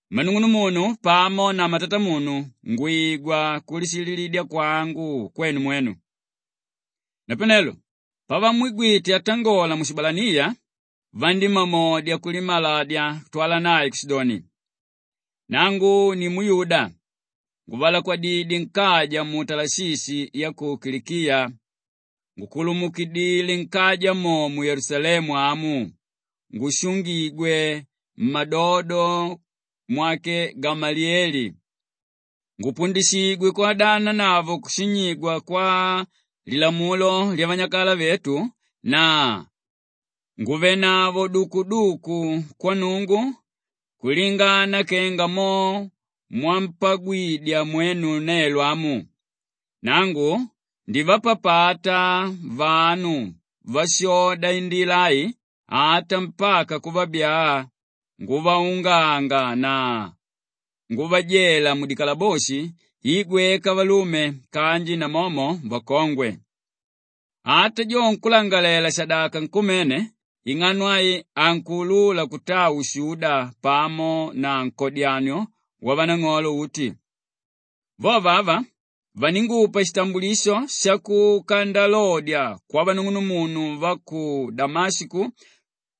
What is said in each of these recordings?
“Mmanung'unumunu pamo na mmatatamunu, ngwigwa kulishililidya kwangu kwenu mwenu.” Napanelo pavamwigwite atangola mushibalaniya, vandímamodya kulimaladya kutwala nae kushidoni, “Nangu ni muyuda nguvalakwadidye nkaja mu Talashishi ya ku Kilikiya ngukulumukidile nkaja mo mu Yelusalemu amu ngushungigwe mmadodo mwake Gamaliyele ngupundishigwe kwodananavo kushinyigwa kwa Lilamulo lyavanyakala vetu na nguvanavo dukuduku kwa Nnungu kulingana kenga mo mwampagwidya mwenu nelo amu. Nangu ndivapapata vanu váshoda Indila ai ata mpaka kuvabyaa nguvaunganga na nguvajela mudikalaboshi i gweka valume kanji namomo vakongwe. Ata jo nkúlangalalela-shadaka nkumene ing'ano ai ankuulula kutaa ushuda pamo na nkodyanio wavanang'olo uti. Vovo ava vaningupa shitambulisho shakuka ndalodya kwavanung'unumunu va ku Damashiko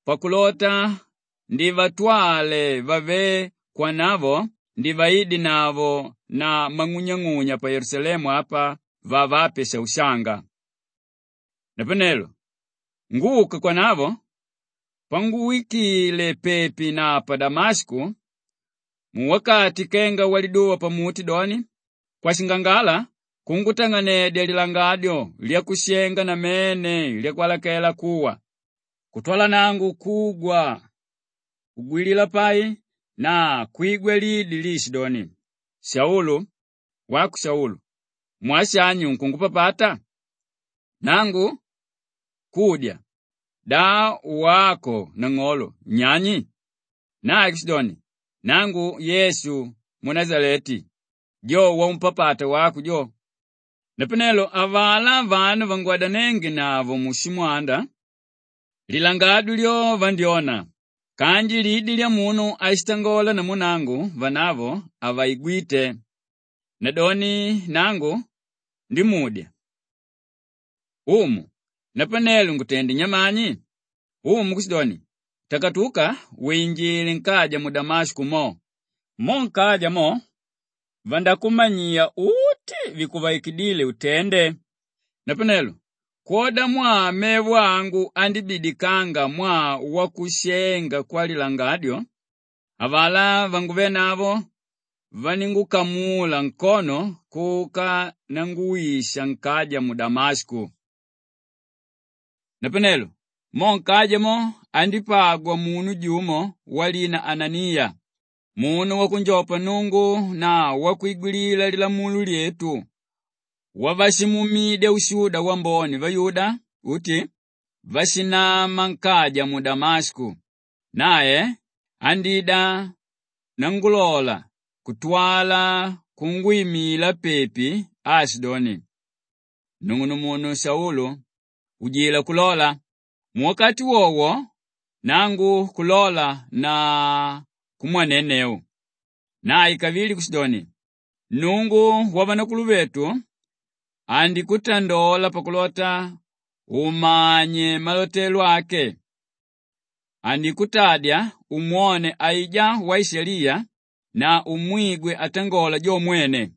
pakulota ndivatwale vavé kwanavo ndivaidenavo na mang'unyang'unya pa Yelusalemu apa vavape shaushanga. “Napanelo nguka kwanavo, panguwikile pepi na pa Damashiko, muwakati kenga waliduva pamuti doni, kwashingangala kungutang'anedya lilangadyo lyakushenga namene lyakwalakela kuwa kutwala nangu kugwa kugwilila pai na kwigwa lidi liishidoni, ‘Saulu, wako Saulu! Mwaa shani unkungupapata?’ Nangu kudya, ‘Da wako nang'olo unyani?’ Nae kushidoni, ‘Nangu Yesu munashaleti, jo waumpapata wako jo.’ Napanelo avalá vanu vángwadanengenavo mushimwanda, lilangadyo lyo vandyóna kanji lidi lyamunu áshitangola namu nangu vanavo havaigwíte. Nadoni nangu ndímudya, ‘Umu, napanelo ngutende nyamani?’ Umu kushidoni, ‘Takatuka winjile nkaja mu Damashiko mo! Mo nkaja mo vandakumanyiya uti vikuvaikidíle utende.’ Napanelo kwodamwaa mevo angu andíbidikanga mwaa wakushenga kwalilangadyo, avalá vanguvénavo vaníngukamula nkono kuka nanguwisha nkaja mu Damashiko. “Napanelo mo nkaja mo andípagwa munu jumo walina Ananiya, munu wakunjopa Nnungu na wakwigwilila lilamulo lyetu, wavashimuumidya ushuda wambone vayuda uti váshinanama nkaja mu Damashiko, nae andída nangulola kutwala kungwimila pepi aashidoni, ‘Nung'unumunu Saulu, ujila kulola!’ Muwakati wowo nangu kulola na kumwanenneu. Nae kavili kushidoni, ‘Nnungu wavanakuluvetu andikutandola pakulota umanye malotelo ake, andikutadya umwone aijá Waishaliya na umwigwe atangola jo mwene.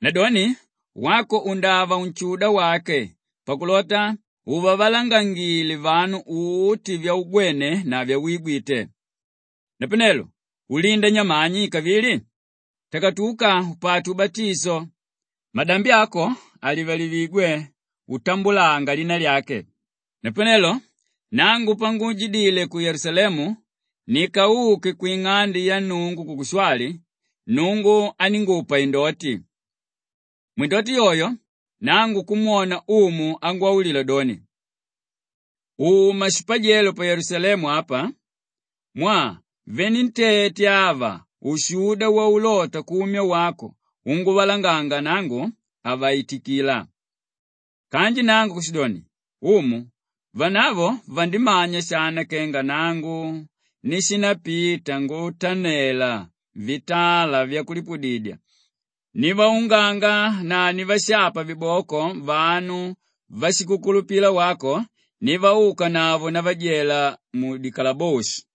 Nadoni wako undava unshuda wake pakulota uvavalangangile vanu uti vyaugwene na vyawigwite. Napanelo ulinda nyamani kavili? Takatuka upate ubatisho, madambi ako alivalivigwe utambulanga lina lyake.’ “Napanelo nangu panguujidile ku Yelusalemu, nikauke kwing'ande ya Nnungu kukushwali, Nnungu aníngupa indoti. Mwindoti yoyo nangu kumwona Umu angwaulila doni, ‘Uma shipajelo pa Yelusalemu apa mwaa venentete ava ushuda waulota kumya wako unguvalanganga nangu, havaitikila.’ Kanji nangu kushidoni, ‘Umu vanavo vandimanya shana kenga nangu nishindapita ngutanela vitala vyakulipudidya, nivaunganga na nivashapa viboko vanu váshikukulupila wako, nivaukanavo ndavajela mudikalaboshi.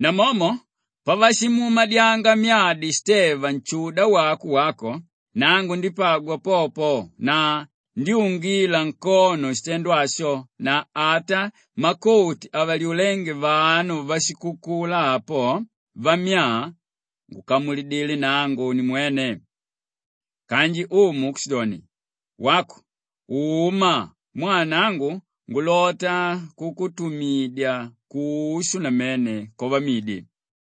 Namomo pavashimuumadyanga myadi Shiteva nshuda wako wako, nangu ndípagwa popo na ndyúngila nkono shitendo asho na ata makoti avalyulénge vanu váshikukula apo vammyaa, ngukamulidile nangu nimwene.’ Kanji Umu kushidoni, ‘Wako uma mwaa nangu ngulota kukutumidya kushu namene kwavamidi.’”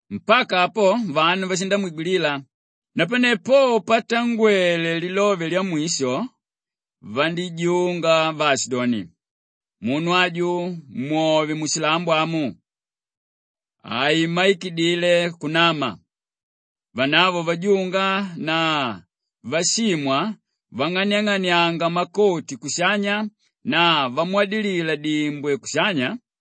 Mpaka apo vanu vashindamwigwilila, napane po patangwele lilove lyamwisho, vandíjunga vaashidoni, “Munu aju mwovye mushilambo amu! Haimmaikidile kunama.” Vanavo vajunga na vashimwa vang'aniang'anianga makoti kushanya na vamwadilila dimbwe kushanya,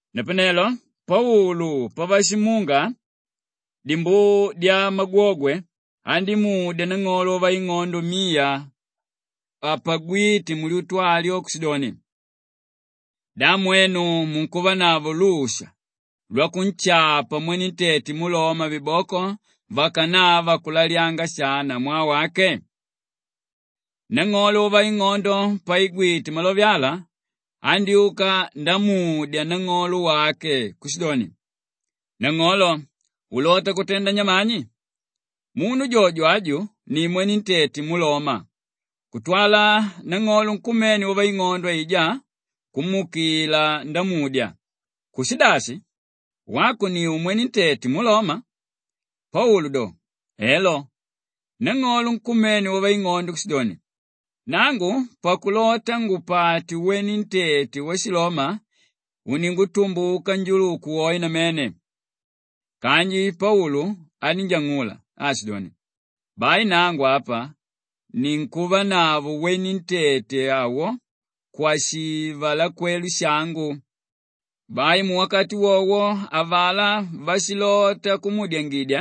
Napanelo Paulu pavashimunga dimbuu dyamagwogwe, andímudya nang'olo wavaing'ondo miya apagwíte mulyutu alyo kushidoni, “Da mwenu munkuvanavo lusha lwakunshapa mwenentete muloma viboko vakanava kulalyanga shana mwaa wake?” Nang'olo wavaing'ondo paigwite malove ala, andyúka ndamudya nang'olo wake kushidoni, “Nang'olo, ulota kutenda nyamani? Munu jojo aju ni mwenentete muloma.” Kutwala nang'olo nkumene wavaing'ondo aijá kumuukila ndamudya, “Kushidashi, wako ni umwentete muloma?” Paulu doni, “Elo!” Nang'olo nkumene wavaing'ondo kushidoni, “Nangu pakulota ngupate wenentete washiloma uningutumbuka njuluku woe namene.” Kanji Paulu anínjang'ula aashidoni, “Bai nangu apa ninkuvanavo wenentete awo kwashivalekwelo shangu.” Bai muwakati wowo avalá váshilota kumuudyangidya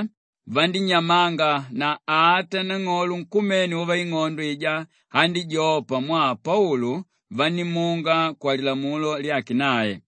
vandínyamanga na ata nang'olo nkumene wavaing'ondo aijá andíjopa mwaa Paulu vanímunga kwalilamulo lyake nae.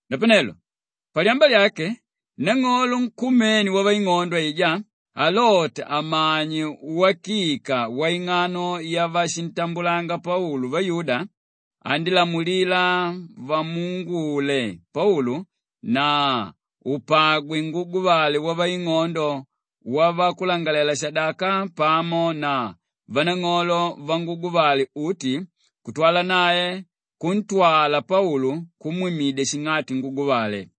Napanelo palyamba lyake, nang'olo nkumene wavaing'ondo aijá alota amanye uwakika waing'ano yavashintambulanga Paulu vayuda, andílamulila vamuungule Paulu na upagwe nguguvale wavanang'olo vavakulangalalela-shadaka pamo na vanang'olo vanguguvale uti kutwala nae kuntwala Paulu kumwimidya shing'ati nguguvale.